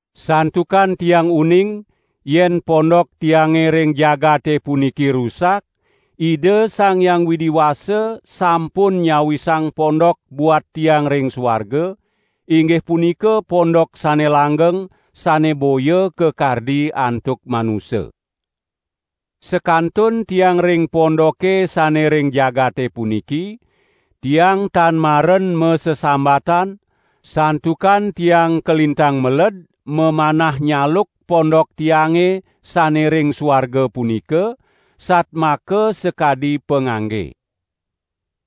Santukan tiang uning, yen pondok tiange ring jagate puniki rusak, Ida Sang Hyang Widi Wasa sampun nyawisang pondok buat tiang ring suarga, inggih punika pondok sane langgeng, sane boya kakardi antuk manusa. Sakantun tiang ring pondoke sane ring jagate puniki, tiang tan maren masesambatan, santukan tiang kalintang meled mamanah nyaluk pondok tiange sane ring suarga punika, satmaka sakadi pangangge.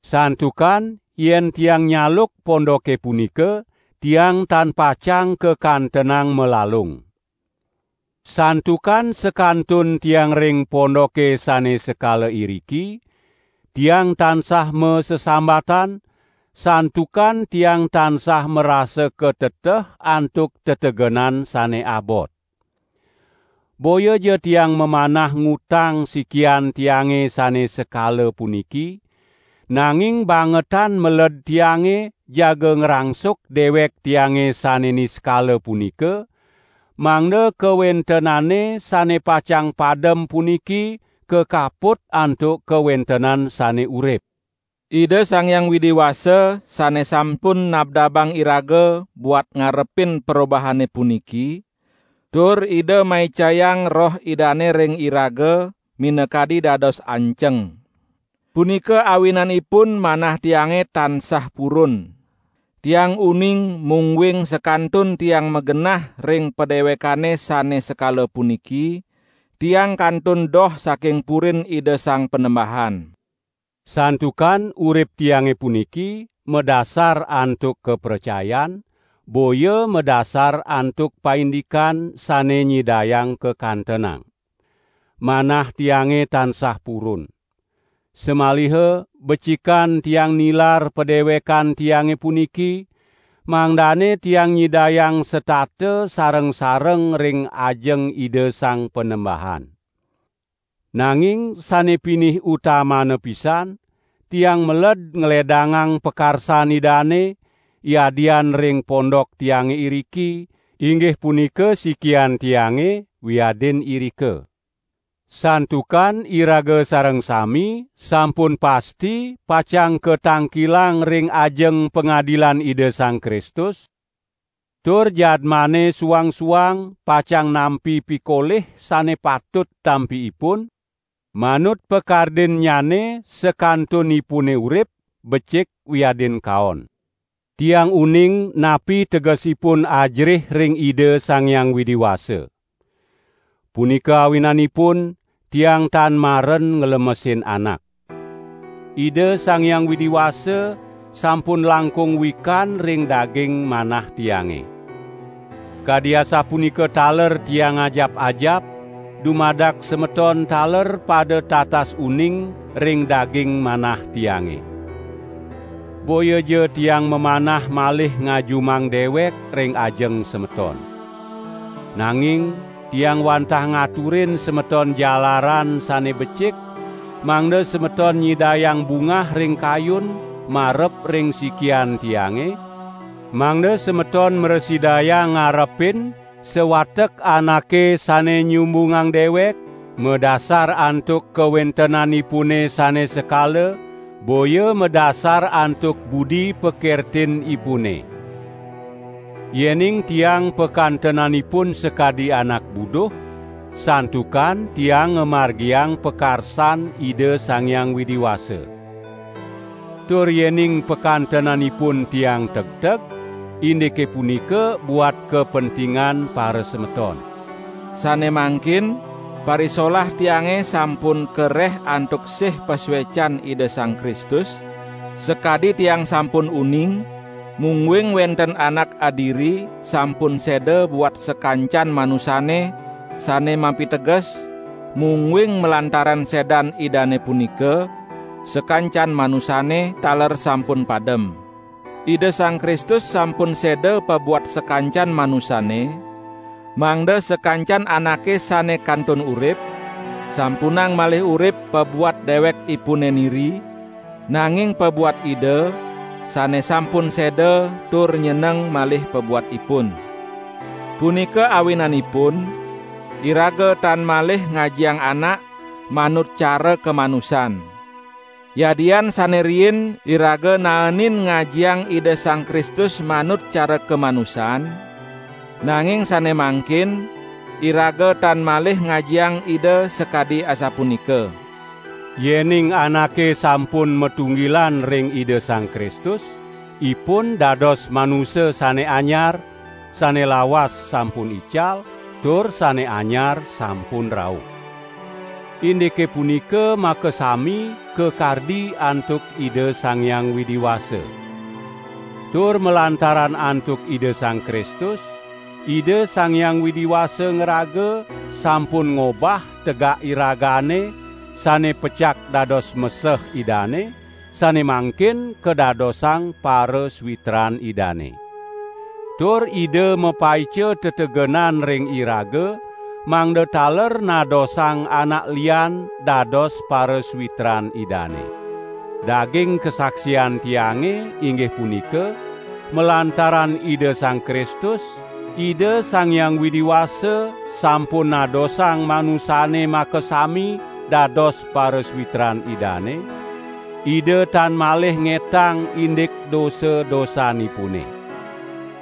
Santukan yen tiang nyaluk pondoke punika, tiang tan pacang kakantenang malalung. Santukan sakantun tiang ring pondoke sane sekala iriki, tiang tansah masesambatan, santukan tiang tansah marasa kateteh antuk tetegenan sane abot. Boyaja tiang mamanah ngutang sikian tiange sane sekala puniki, nanging bangetan meled tiange jaga ngrangsuk dewek tiange sane niskala punika, mangda kawentenane sane pacang padem puniki kakaput antuk kawentenan sane urip. Ida Sang Hyang Widi Wasa sane sampun nabdabang iraga buat ngarepin perobahane puniki, tur Ida maicayang Roh Idane ring iraga, minakadi dados anceng. Punika awinanipun manah tiange tansah purun. Tiang uning mungguing sakantun tiang magenah ring padewekane sane sekala puniki, tiang kantun doh saking purin Ida Sang Panembahan. Santukan urip tiange puniki, madasar antuk kapracayan, boya madasar antuk paindikan sane nyidayang kakantenang. Manah tiange tansah purun. Samaliha becikan tiang nilar padewekan tiange puniki, mangdane tiang nyidayang setata sareng-sareng ring ajeng Ida Sang Panembahan. Nanging sane pinih utamana pisan, tiang meled ngledangang pakarsan Idane, yadian ring pondok tiange iriki, inggih punika sikian tiange, wiadin irika. Santukan iraga sareng sami sampun pasti pacang katangkilang ring ajeng pangadilan Ida Sang Kristus, tur jadmane suang-suang pacang nampi pikolih sane patut tampi ipun, manut pakardinnyane sakantunipune urip, becik wiadin kaon. Tiang uning napi tegesipun ajerih ring Ida Sang Hyang Widi Wasa. Punika awinanipun tiang tan maren nglemesin anak. Ida Sang Hyang Widi Wasa sampun langkung wikan ring daging manah tiange. Kadi asapunika taler tiang ngajap-ajap dumadak semeton taler pada tatas uning ring daging manah tiange. Boyaja tiang mamanah malih ngajumang dewek ring ajeng semeton. Nanging tiang wantah ngaturin semeton jalaran sane becik mangda semeton nyidayang bungah ring kayun marep ring sikian tiange, mangda semeton mrasidayang ngarepin sawatek anake sane nyumbungang dewek madasar antuk kawentenanipune sane sekala, boya madasar antuk budi pakertinipune. Yening tiang pakantenanipun sakadi anak buduh, santukan tiang ngamargiang pakarsan Ida Sang Hyang Widi Wasa. Tur yening pakantenanipun tiang tegteg, indike punika buat kapentingan parasemeton. Sane mangkin parisolah tiange sampun kareh antuk sih pasuecan Ida Sang Kristus, sakadi tiang sampun uning mungguing wenten Anak adiri sampun seda buat sakancan manusane, sane mapiteges mungguing malantaran sedan Idane punika, sakancan manusane taler sampun padem. Ida Sang Kristus sampun seda pabuat sakancan manusane, mangda sakancan anake sane kantun urip, sampunang malih urip pabuat dewekipune niri, nanging pabuat Ida, sane sampun seda tur nyeneng malih pabuat ipun. Punika awinanipun iraga tan malih ngajiang anak manut cara kamanusan. Yadian sane riin iraga naenin ngajiang Ida Sang Kristus manut cara kamanusan, nanging sane mangkin iraga tan malih ngajiang Ida sakadi asapunika. Yening anake sampun matunggilan ring Ida Sang Kristus, ipun dados manusa sane anyar; sane lawas sampun ical, tur sane anyar sampun rauh. Indike punika makasami kakardi antuk Ida Sang Hyang Widi Wasa. Tur malantaran antuk Ida Sang Kristus, Ida Sang Hyang Widi Wasa ngraga sampun ngobah tegak iragane sane pecak dados meseh Idane, sane mangkin kadadosang parasawitran Idane. Tur Ida mapaica tetegenan ring iraga mangda taler nadosang anak lian dados parasawitran Idane. Daging kasaksian tiange, inggih punika, malantaran Ida Sang Kristus, Ida Sang Hyang Widi Wasa sampun nadosang manusane makasami dados parasawitran Idane, Ida tan malih ngetang indik dosa-dosanipune.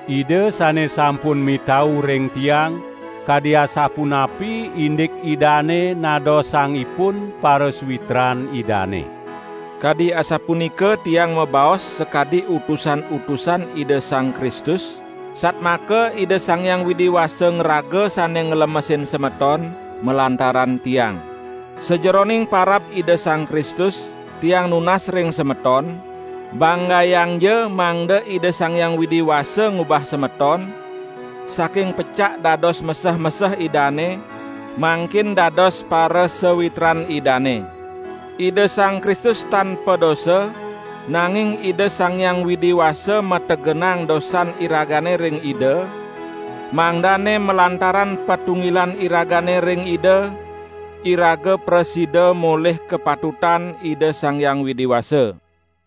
Ida sane sampun mitau ring tiang kadi asapunapi indik Idane nadosang ipun parasawitran Idane. Kadi asapunika tiang mabaos sakadi utusan-utusan Ida Sang Kristus, satmaka Ida Sang Hyang Widi Wasa ngraga sane nglemesin semeton, malantaran tiang. Sajeroning parab Ida Sang Kristus, tiang nunas ring semeton, banggayangja mangda Ida Sang Hyang Widi Wasa ngubah semeton, saking pecak dados meseh-meseh Idane, mangkin dados parasawitran Idane. Ida Sang Kristus tan padosa, nanging Ida Sang Hyang Widi Wasa mategenang dosan iragane ring Ida, mangdane malantaran patunggilan iragane ring Ida, iraga prasida molih kapatutan Ida Sang Hyang Widi Wasa.